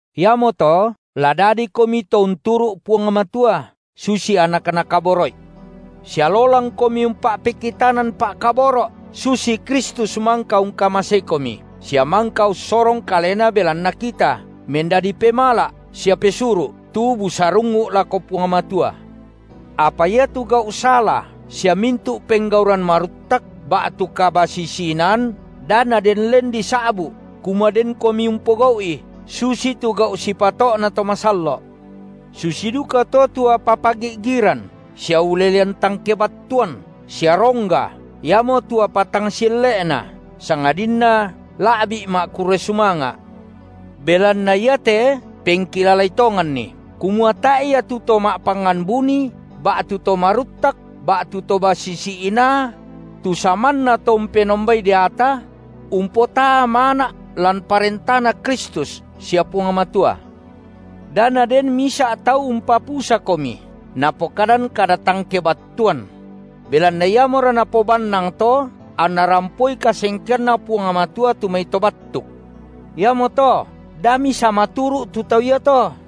Iamoto, la dadikomi to unturu’ Puang Matua, susi anak Nakaboro’i, sia lolangkomi umpa’pekitanan pa’kaboro’ susi Kristus mangka ungkamaseikomi, sia mangka ussorong Kalena belanna kita, mendadi pemala’ sia pesuru’, tu busarungngu’ lako Puang Matua. Apa iatu gau’ sala sia mintu’ penggauran maruttak ba’tu kabasisi-inaan, da naden len disa’bu’ kumua denkomi umpogau’i, susi tu gau’ sipato’na to masallo’. Susi dukato tu apa pagi’giran sia ulelean tang kebattuan sia rongga, iamotu apa tang sielle’na, sangadinna la’bi’ ma’kurre sumanga’. Belanna iate pengkilalai tonganni, kumua tae’ ia tu to ma’pangngan buni ba’tu to maruttak ba’tu to basisi inaa – tu samanna to umpenombai deata – umpotaa mana’ lan ParentaNa Kristus sia Puang Matua. Da naden misa’ tau umpapusakomi napokadan kada tang kebattuan; belanna iamora napobannang to anna rampoi kasengkeanNa Puang Matua tu mai to battuk. Iamoto da misamaturu’ tu tau iato.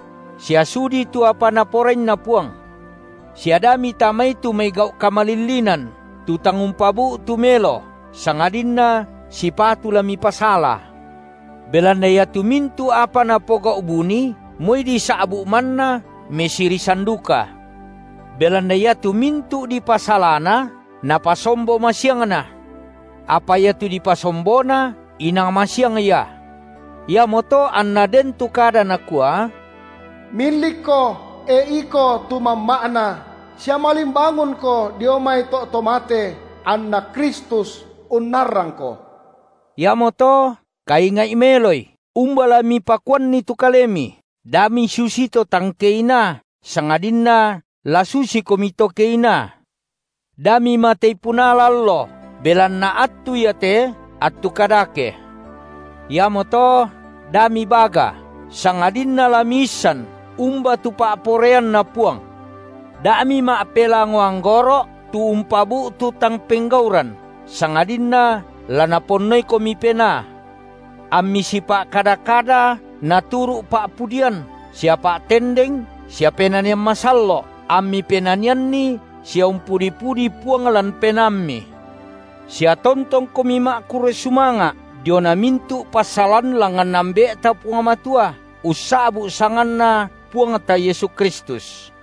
sia sudii tu apa Naporainna Puang. Sia da mitamai tu mai gau’ kamalillinan, tu tang umpabu’tu melo, sangadinna sipatu la mipasala, belanna iatu mintu’ apa napogau’ buni, moi disa’bu’ manna mesirisan duka. Belanna iatu mintu’ dipasalana, napasombo masiangna. Apa iatu dipasombona, inang masiang ia. Iamoto anna den tu kada nakua: Millikko, e iko tu mamma’na, sia malimbangunko dio mai to’ to mate, anna Kristus unnarrangko. Iamoto kainga’i meloi, umba la mipakuanni tu kalemi, da misusi to tang keinaa, sangadinna la susikomi to keinaa; da mimatei punala allo, belanna attu iate, attu kadake. Iamoto, da mibaga, sangadinna la miissan umba tu pa’poraianNa Puang. Da mima’pelango anggoro’ tu umpabu’tu tang penggauran, sangadinna la Naponnoikomi Penaa, ammi sipa’kada-kada naturu’ pa’pudian sia pa’tendeng sia penanian masallo’ ammi penanianni sia umpudi-pudi Puang lan penaammi; sia tontongkomi ma’kurre sumanga’ diona mintu’ passalan langngan Ambe’ta Puang Matua, ussa’bu’ sanganNa Puangta Yesu Kristus,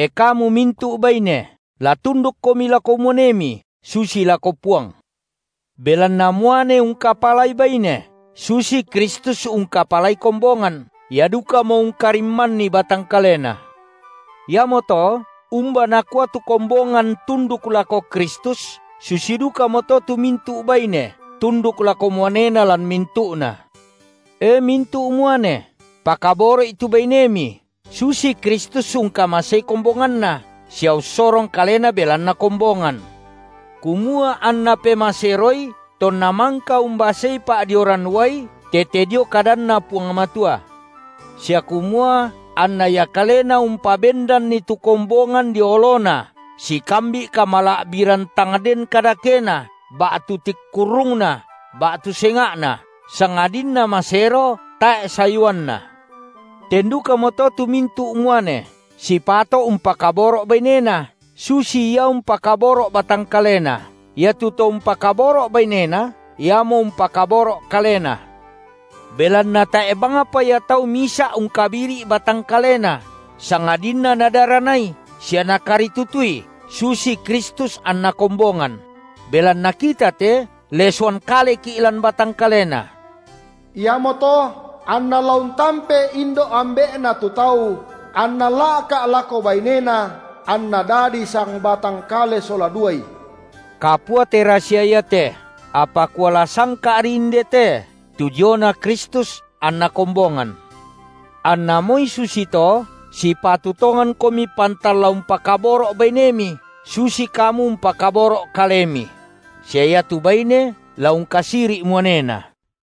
E kamu mintu’ baine, la tundukkomi lako muanemi susi lako Puang, belanna muane ungkapalai baine, susi Kristus ungkapalai kombongan, Ia dukamo ungkarimmanni batang kaleNa. Iamoto, umba nakua tu kombongan tunduk lako Kristus, susi dukamoto tu mintu’ baine tunduk lako muanena lan mintu’na. E mintu’ muane, pakaboro’i tu bainemi, susi Kristus ungkamasei kombonganNa, sia ussorong Kalena belanna kombongan, kumua anNa pemaseroi tonna mangka umbasei pa’dioran uai tete dio kadanna Puang Matua, sia kumua anna Ia kalena umpabendanni tu kombongan dio oloNa sikambi’ kamala’biran tang den kadakena ba’tu tingkurrungna ba’tu senga’na, sangadinna masero tae’ sayuanna. Ten dukamoto tu mintu’ muane sipato’ umpakaboro’ bainena, susi ia umpakaboro’ batang kalena. Iatu to umpakaboro’ bainena, iamo umpakaboro’ kalena. Belanna tae’ bangpa ia tau misa’ ungkabiri’ batang kalena, sangadinna nadaranai sia nakaritutui susi Kristus anna kombongan; belanna kita te lesoan kaleki’ lan batang kaleNa. Iamoto anna la untampe indo’ ambe’na tu tau, anna la’ka’ lako bainena, anna dadi sangbatang kale sola duai. Kapua te rasia iate, apa kuala sangka’ri inde te tu diona Kristus anna kombongan. Anna moi susito, sipatu tongankomi pantan la umpakaboro’ bainemi susi kamu umpakaboro’ kalemi; sia iatu baine la ungkasiri’ muanena.